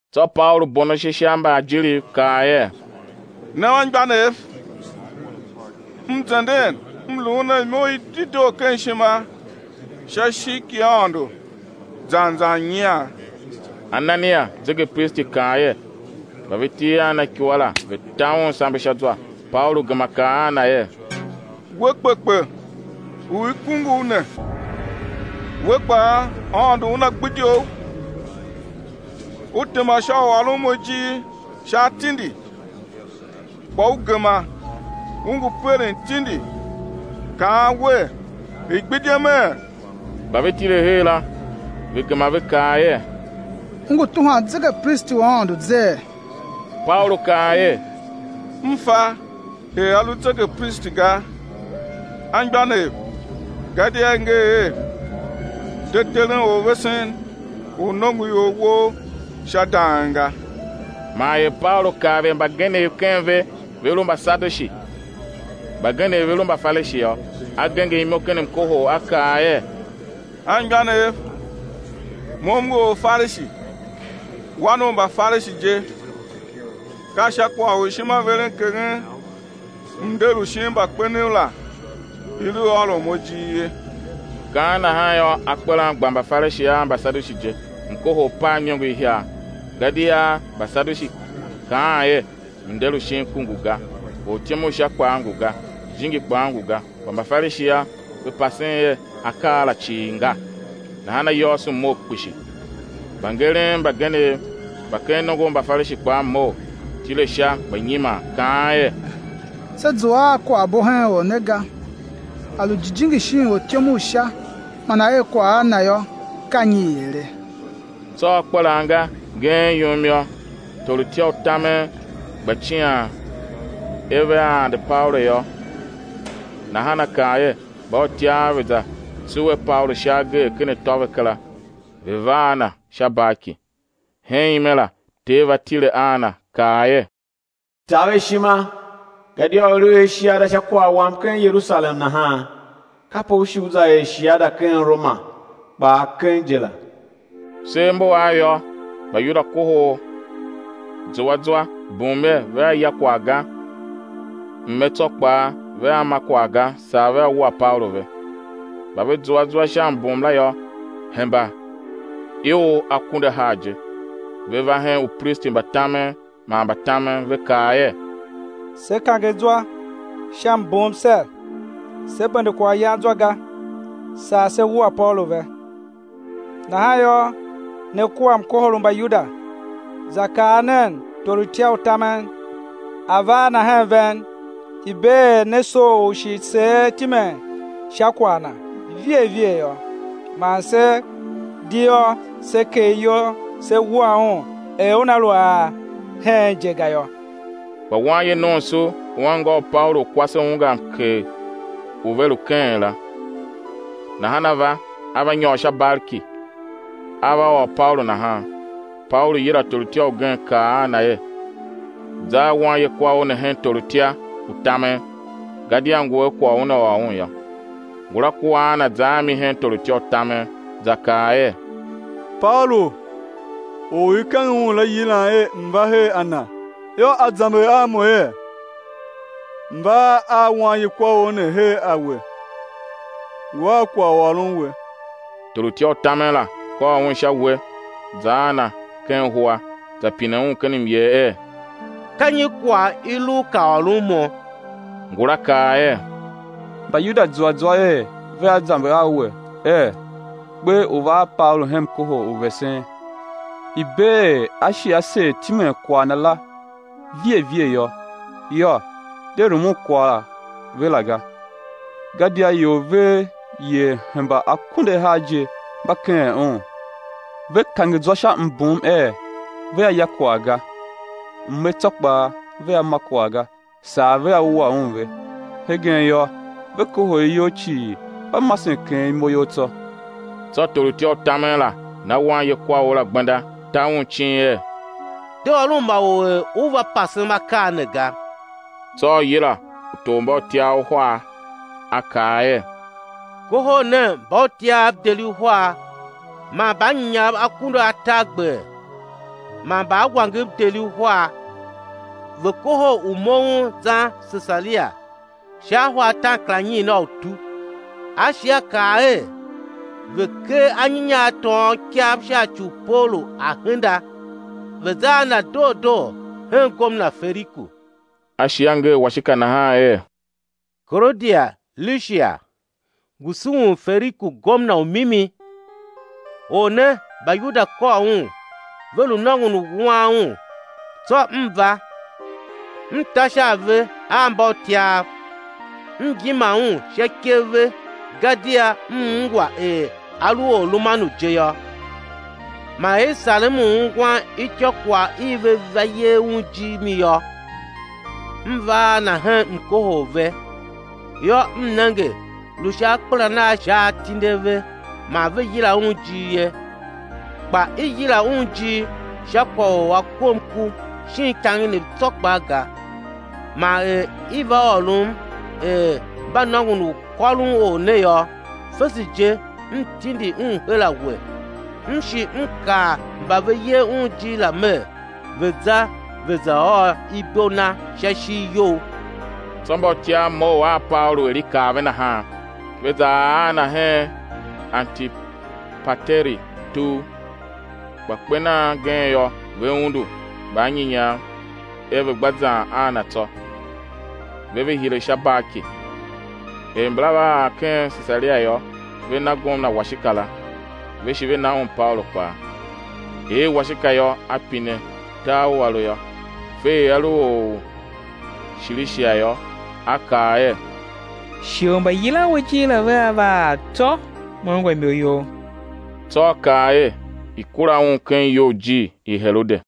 Tsô Paulu bon ashe sha mbaajiriv, kaa er: Ne anmgbianev, m zenden m luun a imo i dedoo ken ishima sha ishigh ki Aôndo zan zan nyian. Anania, zegepristi, kaa er, mba ve til a na ikua la, ve̱ ta un sambe sha zwa. Paulu gema kaa a na er: We kpekpe u i kungu u ne, we kpaa Aôndo Una gbidye u; u tema sha u ôron mo ijir sha atindi, kpa u gema u ngu peren tindi kaan wer, i̱ gbidyeme? Mba ve tile her la, ve gema ve kaa er: U ngu tuhwan zegepristi u Aôndo zee? Paulu kaa er: M fa er a lu zegepristi ga, anmgbianev, gadia i nger er: De teren orvesen u nongoior wou sha dang ga. Man er Paulu kav er mbagenev ken ve ve lu Mbasadushi, mbagenev ve lu Mbafarishi yô, a genger imo ken mkohol, a kaa er: Anmgbianev, mo m ngu Orfarishi, wan u Mbafarishi je. Ka sha kwagh u ishimaverenkeghen mnder u shin mbakpenev la i lu ôron mo ijir ye. Kaan nahan yô, akperan gba Mbafarishi a Mbasadushi je, mkohol pav iniongo ihiar. Gadia Mbasadushi kaan er: mnder u shin ku ngu ga, ortyom u Sha kpaa ngu ga, jijingi kpaa ngu ga; kpa Mbafarishi yô, ve pasen er akaa la cii nga. Nahan ayôôso mough kpishi. Mbangeren mbagenev mba ken nongo u Mbafarishi kpaa mough, tile sha gba nyiman, kaan er: Se zua a kwaghbo hen or ne ga. A lu jijingi shin ortyom u Sha man a er kwagh a na yô, ka nyi i ere? Tsô akpelan nga ngeen yum yô, torutya u tamen gba cian er vea ande Paulu yô, nahan a kaa er, mbautyav ve̱ za tsuwe Paulu sha agee ken atô ve kera, ve̱ va a na sha barki. Hen ime la Ter va tile a na kaa er: Taver ishima, gadia er u er shiada sha kwagh Wam ken Yerusalem nahan, kape ú shi ú za er shiada ken Roma kpaa keng je la. Sev mbu av yô, Mbayuda kohol zua zwa, bum er, vea ya kwagh ga, mme tsô kpaa, vea ma kwagh ga, saa vea wua Paulu ve. Mba ve zua zwa sha mbum la yô, hemba ior akunduahar je. Ve va hen upristi mba tamen man mbatamen, ve kaa er: Se kange zwa sha mbum ser, sé bende kwaghyan zwa ga, saa sé wua Paulu ve. Nahan yô, ne kua mkohol u Mbayuda, za kaa nen torutya u tamen, a̱ va a na hen ven, i̱ bee er ne soo u shi seer timen sha kwagh na vighe vighe yô, man se di yô, sé kegh iyol, sé wua un er una lu a ar heen je ga yô. Kpa wanye nomso u anngô u Paulu u kwase ungwa mkegh u ve lu keghen la, nahan a va, a va nyôr sha barki, a va ôr Paulu nahan. Paulu yila torutya ugen, kaa a na er: Za a wanyekwaor ne hen torutya u tamen, gadia ngu a kwagh u una ôr un yô. Ngula kua a na, za a mi hen torutya u tamen, za kaa er: Paulu, or u i kange un la, yilam er m̱ va her a na, yô, a zamber a mo er, m̱ va a wanyekwaor ne her a we, ngu a kwagh u ôron we. Torutya u tamen la kôr un sha uwe, za a na ken huwa, za pine un ken myer er: Ka nyi kwagh i lu u ka ôron mo? Ngula kaa er: Mbayuda zua zwa er vea zamber a we er, kper u̱ va a Paulu hen mkohol u vesen, i̱ bee er á shi á seer timen kwagh na la vighe vighe yô. Yô, de rumun kwagh ve la ga, gadia ior vev yer hemba akunduahar je mba keghen un, ve kange zwa sha mbum er vea ya kwagh ga, mme tsô kpaa vea ma kwagh ga, saa vea wua un ve. Hegen yô, ve kohol iyol cii, mba masen keghen imo you tsô. Tsô torutya u tamen la na wanyekwaor la gbenda, ta un icin er: De ôron ma or er u va pasem akaa ne ga. Tsô a yila utormbautyav uhar, a kaa er: Kohol nen mbautyav deri uhar, man mbaanyinyav akunduatargber man mbaawangev deri uhar, ve̱ kohol u moughon zan Sesaria sha ahwa ataankaranyiin a utu. A shi a kaa er, ve̱ ker anyinya a tôôn ikav sha ci u Paulu a̱ henda, ve̱ za a na doo doo hen gomna Feliku. A shi a nger washika nahan er: Kaloudia Lishia, ngu sughun Feliku, gomna u mimi. Or ne, Mbayuda kôr un, ve lu nôngon u wuan un; tsô m va, m ta sha a ve a mbautyav, m yima un sha ikev ve gadia m ungwa er a lu Orromanu je yô. Man er i sarem u ungwan ityôkwagh i ve va yer un ijir mi yô, m va a na hen mkohol ve; yô, m nenge lu sha akpelan a sha atindi a ve man ve yila un ijir ye; kpa i yila un ijir sha kwagh u a kom ku shin ikangenev tsô kpaa ga. Man er i va ôrom er mba nôngon u kôron or ne yô, fese je m tindi un her a we; m shi m kaa mba ve yer un ijir la mer, ve̱ za ve̱ za ôr ibo na sha ishigh you. Tsô mbautyav mough a Paulu er i kaa ve nahan, ve za ar a na hen Antipateri tugh. Kpa kper nan gen yô, ve undu mbaanyinyav er ve̱ gba zan a na tsô, ve ve hire sha barki. Er mbala va ar ken Sesaria yô, ve na gomna washika la, ve shi ve na un Paulu kpaa. Er washika yô, a pine tar u a lu yô. Fe er a lu or u Shilishia yô, a kaa er: Shighe u mbayilan we ijir la vea va ar tsô me ungwa imo you. Tsô a kaa er, i̱ kura un ken iyoujir i Herode.